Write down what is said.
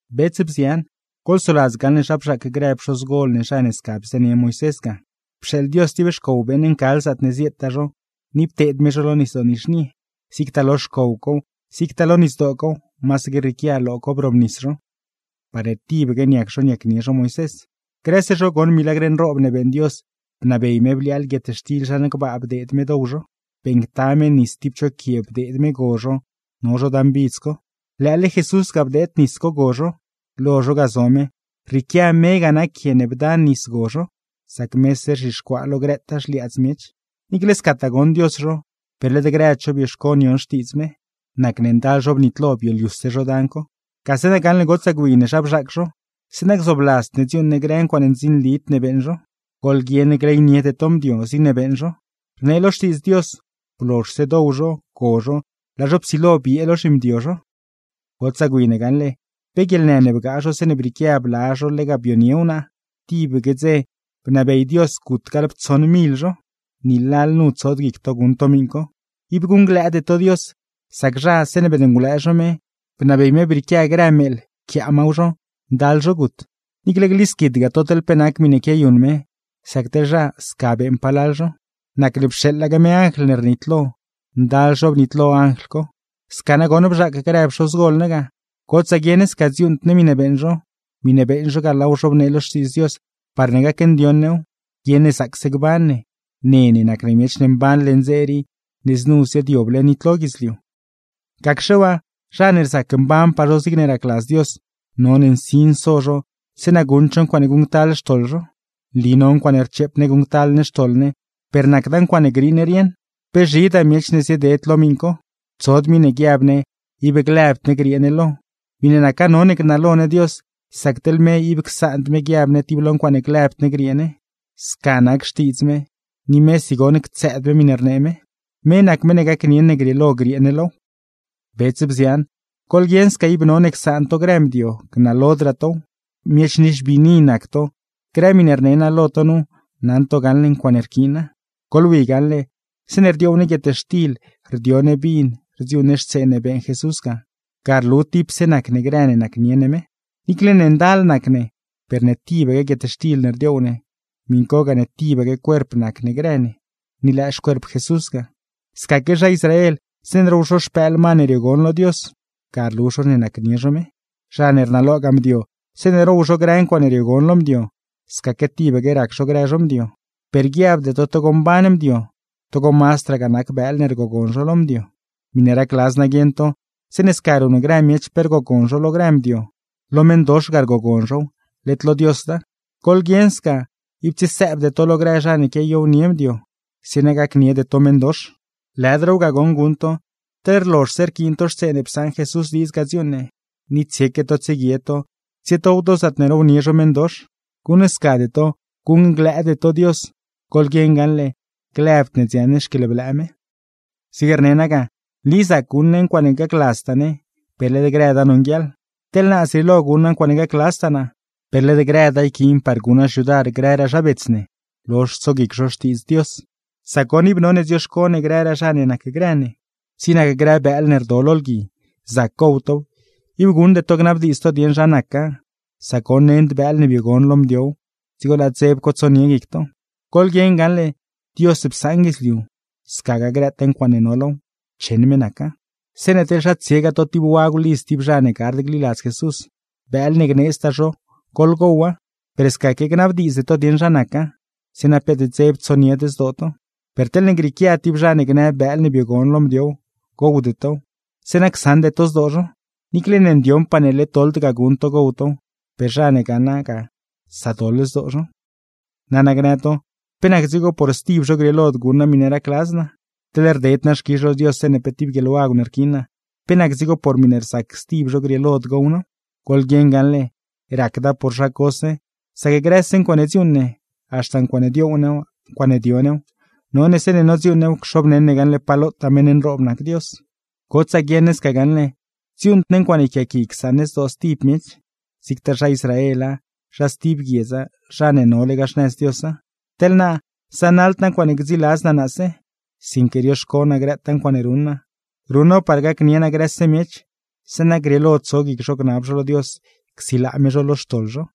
Bets, bzian, goḻsoladz gaṉle zha bzhaac grë pxozgol ne zha ne sca bzënie Moisés ga. Pxeeḻ Dios tib xcow beeṉ ncal zaatne zieetaa zho, ni pteed me zho lo Nisdoo Nizhnie. Zigtaa lo xcow cow, zigtaa lo nisdoo cow, masaque rrieequia lo co brobnis zho, parne tibaque niac zho niacnie zho Moisés. Grëse zho goṉ milagr nroob ne beeṉ Dios, bnabey me bliaaḻ guietxtil zhan gbaa bdeed me dow zho, beeṉcta me nis tib cho quie bdeed me go zho no zho dan bidz co. Lëële Jesús ga bdeed nis co go zho. Lo zho ga zo me, rrieequia me ga nac quie ne bda nis go zho, sac mese rzhixcuaa lo grëtaa xliaadz miech. Niicle scataa goṉ Dios zho, per led grëd zho bioxco nion xtiidz me, nacne ndal zho bnitlo bioliuse zho dan co. Gase na gaṉle gotsaa gwi ne zha bzhaac zho, zeeṉa gzoobladzd ne dziuuṉ ne grë ncuaaṉe ndzinlid ne beeṉ zho. Goḻguieṉ gleyniede to mdio, zigne beeṉ zho. Rnee lo Xtiidz Dios: “Blozhse dow zho, go zho, laa zho psilo biee lo zhimdio zho.” Gotsaa gwi ne gaṉle, pe guieḻnë ne bgaa zho zeeṉe brieequia bla zho lega bionie wnaa, tib dzeque bnabey Dios gut gaḻptsoṉ mil zho. ¡Ni lalnu tsod guic to guṉ to miṉ co! Ib guṉglëëde to Dios, sac zha, zeeṉe beṉngulëë zho me, bnabey me brieequia grë meeḻ pquiaa maw zho, ndal zho gut. Niicle glisquidgaa to teḻ pe nac miṉe quiayuṉ me, sac teḻ zha, sca beeṉ palal zho; nacne pxeeḻaque me anjl ne rnitlo, ndal zho bnitlo anjl co. Sca nagoṉ bzhaac grë pxoz gol ne ga, gotsaa guieṉ ne sca dziuuṉd ne miṉe beeṉ zho, miṉe beeṉ zho ga laaw zhobnee lo Xtiidz Dios parne gacndioṉ new, guieṉ ne zaacse gban ne, ne nac ne miech ne mban leṉ dze rii ne znu ziaadyoble nitlo guidzliu. Gacxe waa, zha ne rzac mbanpaa zho zigne racladz Dios, none nsin so zho zeeṉa guṉd zho ncuaaṉe guṉctal xtoḻ zho. Nli no ncuaaṉe rcheep ne guṉctal ne xtoḻ ne, per nacda ncuaaṉe griiṉ rieṉ. Pe zhidaa miech ne zieded lo miṉ co. Tsod miṉe guiab ne ib lëbd ne griee ne lo. Miṉe naca none gnalo ne Dios, sac teḻ me ib csaand me guiab ne tib lo ncuaaṉe glëbd ne griee ne; sca nac xtiidz me, ni mesi goṉ ctsëëd me miṉe rnee me. Me nac meṉ ne gacnieṉ ne grieelo griee ne low. Bets, bzian, goḻguieṉ sca ib none csaan to grë mdio, gnalodraa tow. Miech nixbiini nac to, grë miṉe rne naa lo to nu, naṉ to gaṉle ncuaaṉe rquiina. Goḻwi gaṉle, zeeṉe rdioow ne guietxtil, rdio ne vin, rdziuuṉ ne xtsee ne beeṉ Jesús ga, ga rlu tipse nac ne grë ne nacnie ne me. Niicle ne ndal nac ne, per ne tibaque guietxtil ne rdioow ne, miṉ co gane tibaque cuerp nac ne grë ne, ni lëë xcuerp Jesús ga. Scaque zha Israel, zeeṉe row zho xpëël ma ne riogon lo Dios, ga rlu zho ne nacnie zho me. Zha ne rnalogaa mdio, zeeṉe row zho grë ncuaaṉe riogon lo mdio, scaque tibaque rac zho grë zho mdio. Per guiabde to togo mban mdio, togo mazdragaa nac bëël ne rgogon zho lo mdio. Miṉe racladz naa guieṉ to, zeeṉe sca ruṉ grë miech pe rgogon zho lo grë mdio, lo meṉdox ga rgogon zhow, led lo Diosda. Goḻguieṉ sca, ib tsiesëëbde to lo grë zha ne quiayownie mdio, zeeṉa gacniede to meṉdox. Lëdraaw ga goṉ guṉ to, teḻ rlozhse rquiin to xtsee ne psaṉ Jesús diidz ga dziuuṉ ne, ni tsieque to tsieguie to, tsietow to zaatne rownie zho meṉdox. ¡Guṉscade to, guṉglëëde to Dios! ¡Goḻguieṉ gaṉle, lëbd ne dziaṉ ne xquieḻblëë me! Zig rne naa ga: “Nli zac guṉ ne ncuaaṉe gacladztaa ne, per led grëda nonguieḻ.” Teḻ naa, zrieelo guṉ naa ncuaaṉe gacladztaa naa, per led grëda yquiin par guṉ naa xyudar grëraa zha bets ne, lozh tsoguic zho Xtiidz Dios; sac goṉ, ib none dzioxco ne grëraa zha ne nacgrë ne. Zig nac grë bëël ne rdo lo lgui, zac gow tow, ib guṉde to gnabdiidz to dieṉ zha naca, sac goṉ nend bëël ne biogon lo mdiow, dzigo laa dzeb co tsonie guic to. Goḻguieṉ gaṉle, Dios psaṉ guidzliu, scagaa grëtaa ncuaaṉe no low cheṉ me naca. Zeeṉe teḻ zha tsiegaa to tib wagw lidz tib zha ne gard gliladz Jesús, bëël ne gneedztaa zho goḻgowa, per scaque gnabdiidzde to dieṉ zha naca; zeeṉa peet dzeb tsonied zdoo to. Per teḻne grieequia tib zha ne gnë bëël ne biogon lo mdiow, gowde tow; zeeṉa csaṉde to zdoo zho. Niicle ne ndioṉpaa ne led doḻd ga guṉ to gow tow, per zha ne gaṉa ga sadoḻ zdoo zho. Nana gnë to: “¿Pe nac dzigo por stib zho grieelod guṉ naa miṉe racladz naa? Teḻ rded naa xquizh lo Dios zeeṉe pe tib guieḻwagw ne rquiin naa, ¿pe nac dzigo por miṉe rzacse stib zho, grieelod gow naaw?” Goḻguieṉ gaṉle, racda por zha cose; sac grëse ncuaaṉe dziuuṉ ne, haxta ncuaaṉe dioow new, ncuaaṉe dio new, none zeeṉe nodziuuṉ new cxobneṉ ne gaṉle pa lotaa meṉ nroob nac Dios. Gotsaa guieṉ ne sca gaṉle dziuuṉd ne ncuaaṉe yquiaaqui csaṉ ne zdoo stib miech, zigtaa zha Israela, zha stib guiedza, zha ne nolegaa xnëz Diosa. Teḻ naa, zanaḻd naa ncuaaṉe gdziladz naa naase, sinque rioxco naa grëtaa ncuaaṉe ruṉ naa, ruṉ naaw par gacnie naa grëse miech, zeeṉa grieelo tso guic zho gnab zho lo Dios csilaa me zho lo xtoḻ zho.